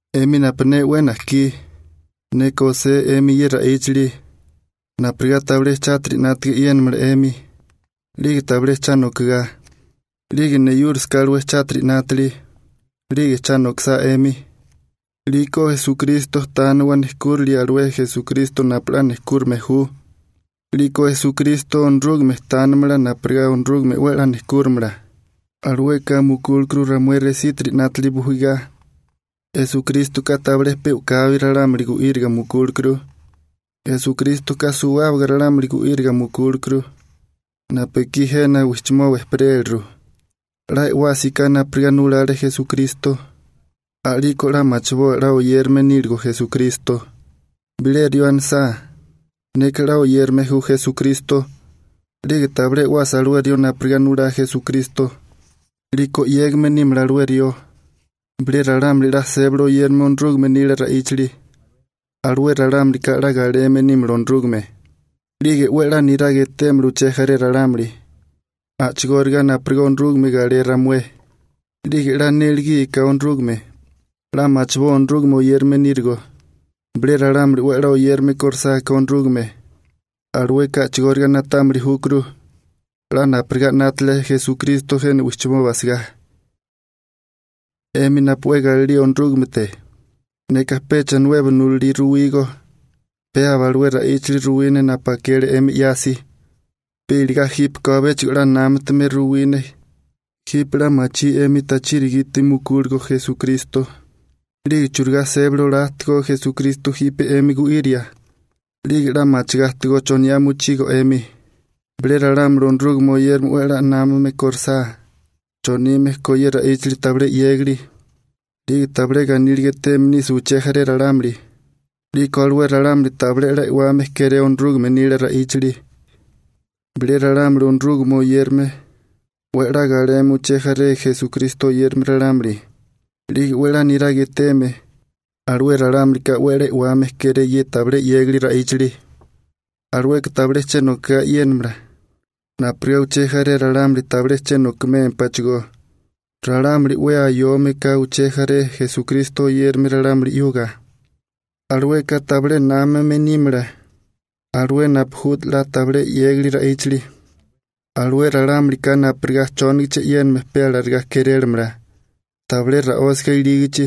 'Emi napu ne 'we najkí, neka osé 'emi ye ra'íchali napurigá tabilé chátiri 'nátaga e'yénamala 'emi, 'lige tabilé cha nokagá. 'Lige neyúrisaká alué chátiri 'nátili 'lige cha nokisá 'emi, 'liko Esukristo tániwa nejkúrali alué Esukristo napu 'la nejkúrime ju, 'liko Esukristo Onorúgame tánimala napurigá Onorúgame 'we 'la nejkúrimala. Alueka mukúlekuru ramué resítiri 'nátili bujigá. Esukrístoka tabilé pe u'kabi ralámuli gu'íriga mukúlekuru, Esukrístoka suwábaga ralámuli gu'íriga mukúlekuru napu ekí jena wijchimoba ejperéliru. 'La e'wásiká napurigá nulale Esukristo, a'liko 'la machiboa 'la oyérame níligo Esukristo. Bilé rió anisá: «Neka 'la oyérame ju Esukristo», 'lige tabilé e'wasa alué rió napurigá nulá Esukristo, 'liko 'yégame nímala alué rió. Bilé ralámuli 'la sébali oyérame Onorúgame nila ra'íchali, alué ralámulika 'la galeme nímala Onorúgame, 'lige 'we 'la niraga etémala uché jaré ralámuli, a'chigóriga napurigá Onorúgame galé ramué. 'Lige 'la nélegíaká Onorúgame, 'la machiboa Onorúgame oyérame nírigo. Bilé ralámuli 'we 'la oyérame kórisáká Onorúgame, alueka a'chigóriga na'támili júkuru 'la napurigá 'nátale Esukristo jena wijchimoba asagá. 'Emi napu 'we galilía Onorúgamete, neka pecha nuebo nulalí ruwígó, pe aba alué ra'íchali ruwí ne napu akele 'emi 'yasi. Pe iligá jípeko abechigó 'la námatume ruwí ne. Jipe 'la machí 'emi tachiri gite mukúligo Esukristo, 'lige churigá sébali olá ajtigó Esukristo jipe 'emi gu'iria, 'lige 'la machigá ajtigó choniá mochigo 'emi. Bilé ralámuli Onorúgame oyérame 'we 'la námame korisá chonime ko ye ra'íchali tabilé 'yégali, 'lige tabilé 'la ganíliga eteme nisa uché jaré ralámuli, 'liko alué ralámuli tabilé 'la e'wame kéré Onorúgame nila ra'íchali. Bilé ralámuli Onorúgame oyérame 'we 'la galeme uché jaré Esukristo oyérame ralámuli, 'lige 'we 'la niraga eteme, alué ralámulika 'we 'la e'wame kéré ye tabilé 'yégali ra'íchali. Alueka tabilé che nokagá e'yénamala, napurigá uché jaré ralámuli tabilé che nokimémpáchigó. Ralámuli 'we ayome ka uché jaré Esukristo oyérame ralámuli 'yuga, alueka tabilé námame nímala alué napu ju 'la tabilé 'yégali ra'íchali, alué ralámulika napurigá chónigichi e'yéname pe alarigá kérélamala, tabilé ra'ósiga ilígichi,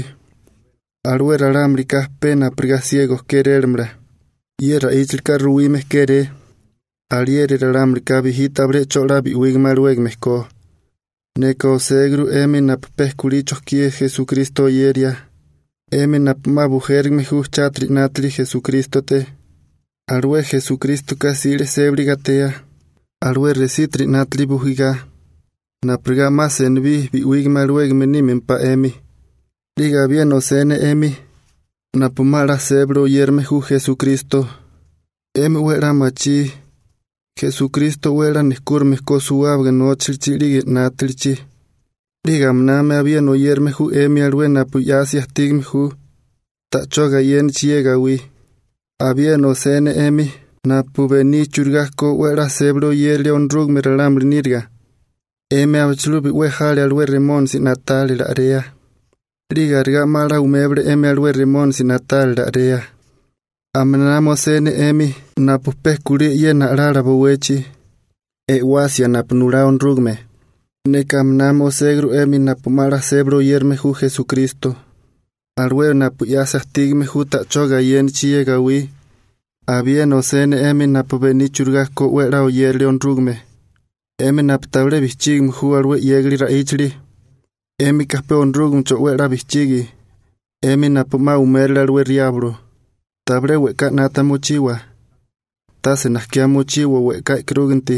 alué ralámulika pe napurigá siego kérélamala. Ye ra'íchalika ruwime kéré alieri ralámulika bijí tabilé 'cho 'la bi'wígame alawégame ko. Neka oséguru 'emi napu pe kulí chojkí Esukristo oyeria, 'emi napu 'ma bujérigame ju chátiri 'nátili Esukrístote, alué Esukrístoka 'sile sébali gatea, alué resítiri 'nátili bujigá, napurigá 'ma senibí bi'wígame alawégame nímempá 'emi. 'Lige abiena osé ne 'emi napu 'ma 'la sébali oyérame ju Esukristo. 'Emi 'we 'la machí Esukristo 'we nejkúrime ko suwábaga nóchalichi 'lige 'nátalichi, 'lige aminami abiena oyérame ju 'emi alué napu 'yasi ajtígame ju ta'chó gayénichi ye gawí. Abiena osé ne 'emi napu bení churigá ko 'we 'la sébali oyérilia Onorúgame ralámuli níriga, 'emi abichilubi 'we jale alué Remónisi na'tálila a'rea, 'lige arigá 'ma 'la umébale 'emi alué Remónisi na'tálila a'rea. Aminami osé ne 'emi napu pe kulí e'yena a'lala bowechi, e'wasia napu nulá Onorúgame. Neka aminami oséguru 'emi napu 'ma 'la sébali oyérame ju Esukristo, alué napu 'yasi ajtígame ju ta'chó gayénichi ye gawí. Abiena osé ne 'emi napu bení churigá ko 'we 'la oyéralia Onorúgame, 'emi napu tabilé bijchígame ju alué 'yégali ra'íchali, 'émika pe Onorúgamecho 'we 'la bijchigi, 'emi napu 'ma umérole alué Riablo. Tabilé we'ká 'nata mochiwa, tase najkiá mochiwa we'ká e'karúginti,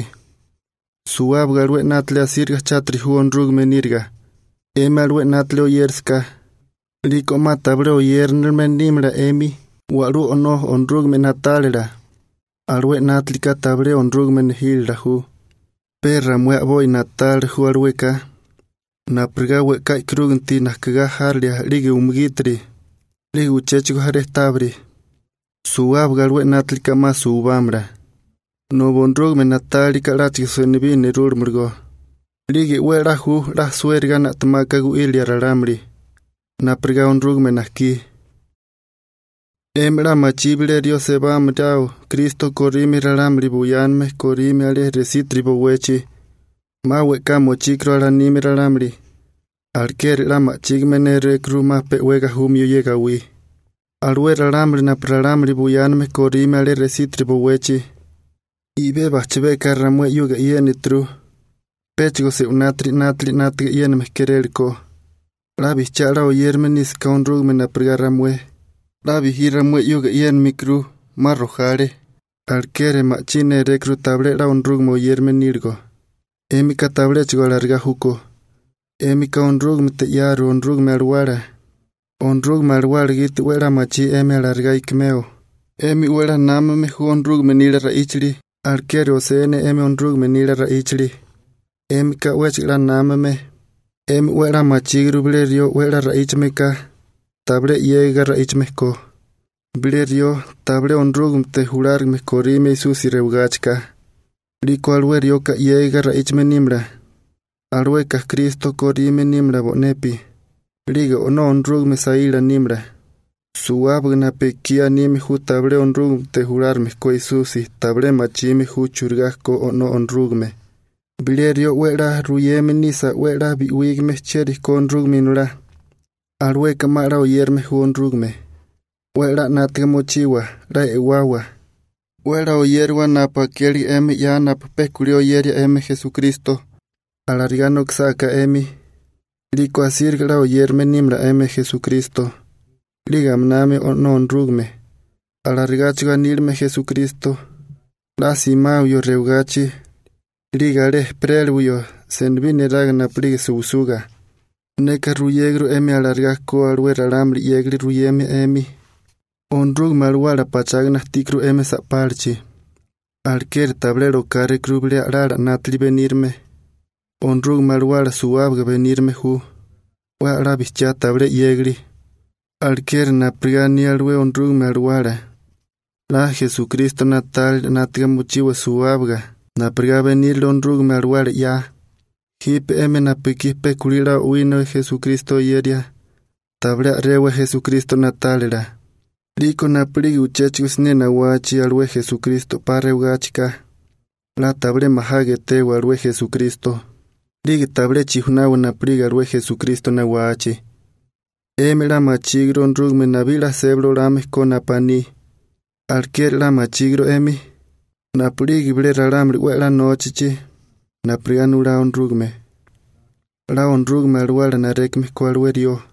suwábaga alué 'nátili asíriga chátiri ju Onorúgame níriga. 'Emi alué 'nátili oyérasaká, 'liko 'ma tabilé oyérinilime nímala 'emi Wa'lula O'nó Onorúgame na'tálila. Alué 'nátilika tabilé Onorúgame nejílala ju, pe ramué a'boi na'tálila ju alueka, napurigá we'ká e'karúginti najkigá járilia 'lige umugítiri, 'lige uchéchigo jaré tábiri. Suwábaga alué 'nátilika 'ma suwibámala, nobi Onorúgame na'tálilaká 'láchigo senibí nerúlamalagó, 'lige 'we 'la ju 'la suériga na'temaka gu'írilia ralámuli, napurigá Onorúgame najkí. 'Emi 'la machí bilé rió sebámaráo Kristo korime ralámuli buyáname korime alé resítiri bowechi, 'ma we'ká mochíkuru alanime ralámuli, alekeri 'la ma'chígime nérékuru 'ma pe 'we gajumio ye gawí. Alué ralámuli napu ralámuli buyáname korime alé resítiri bowechi, i'bé bajchabeka ramué 'yuga e'yénituru péchigo se'winátiri 'nátili 'nátaga e'yéname kérélekó. 'La bijchiá 'la oyérame nísaká Onorúgame napurigá ramué, 'la bijí ramué 'yuga e'yénimikuru, 'ma rojale, alekeri ma'chí nérékuru tabilé 'la Onorúgame oyérame níligo. 'Émika tabiléchigo alarigá júkó. 'Émika Onorúgamete 'yaru Onorúgame Alawala. Onorúgame Alawala gite 'we 'la machí 'emi alarigá ikimeo. 'Emi 'we 'la námame ju Onorúgame nila ra'íchali, alekeri osé ne 'emi Onorúgame nila ra'íchali. 'Émika 'wéchigo 'la námame. 'Emi 'we 'la machíguru bilé rió 'we 'la ra'íchame ka, tabilé 'yégiga ra'íchame ko. Bilé rió, tabilé Onorúgamete julárigame korime Esusi rewigáchika, 'liko alué rioka 'yégiga ra'íchame nímala, alueka Kristo korime nímala bo'nepi, 'lige O'nó Onorúgame saíla nímala. Suwábaga napu ekí anime ju tabilé Onorúgamete julárigame ko Esusi tabilé machime ju churigá ko O'nó Onorúgame. Bilé rió 'we 'la ruyeme nisa 'we 'la bi'wígame chieri ko Onorúgame Inolá, alueka 'ma 'la oyérame ju Onorúgame. 'We 'la 'nátaga mochiwa, 'la e'wawa, 'we 'la oyériwa napu akélige 'emi 'ya napu pe kulí oyeria 'emi Esukristo. Alarigá nokisáká 'emi, 'liko asíriga 'la oyérame nímala 'emi Esukristo, 'lige aminami O'nó Onorúgame. Alarigáchigo aníligame Esukristo 'la simawio rewagachi 'lige alé ejperéliwio senibí neraga napu'lige suwisuga. Neka ruyéguru 'emi alarigá ko alué ralámuli 'yégali ruyeme 'emi. Onorúgame Alawala pachágana ajtíkuru 'emi sa'pálachi, alekeri tabilé rokárékuru bilé a'lala 'nátili benírime. Onorúgame Alawala suwábaga benírime ju, 'we 'la bijchiá tabilé 'yégali. Alekeri napurigá aní alué Onorúgame Alawala 'la Esukristo na'tálila 'nátaga mochiwa suwábaga napurigá benírile Onorúgame Alawala 'ya. Jipe 'emi napu ekí pe kulí 'la o'wina Esukristo oyeria, tabilé a'rewa Esukristo na'tálila. 'Liko napu'lige uchéchigo siné nawachi alué Esukristo 'pa rewagáchika 'la tabilé majaga etewa alué Esukristo, 'lige tabilé chijunawa napu'lige alué Esukristo nawachi. 'Emi 'la machíguru Onorúgame nabí 'la sébali olame ko napu aní. Alekeri 'la machíguru 'emi napu'lige bilé ralámuli 'we 'la nóchachi napurigá nulá Onorúgame, 'la Onorúgame Alawala narékame ko alué rió.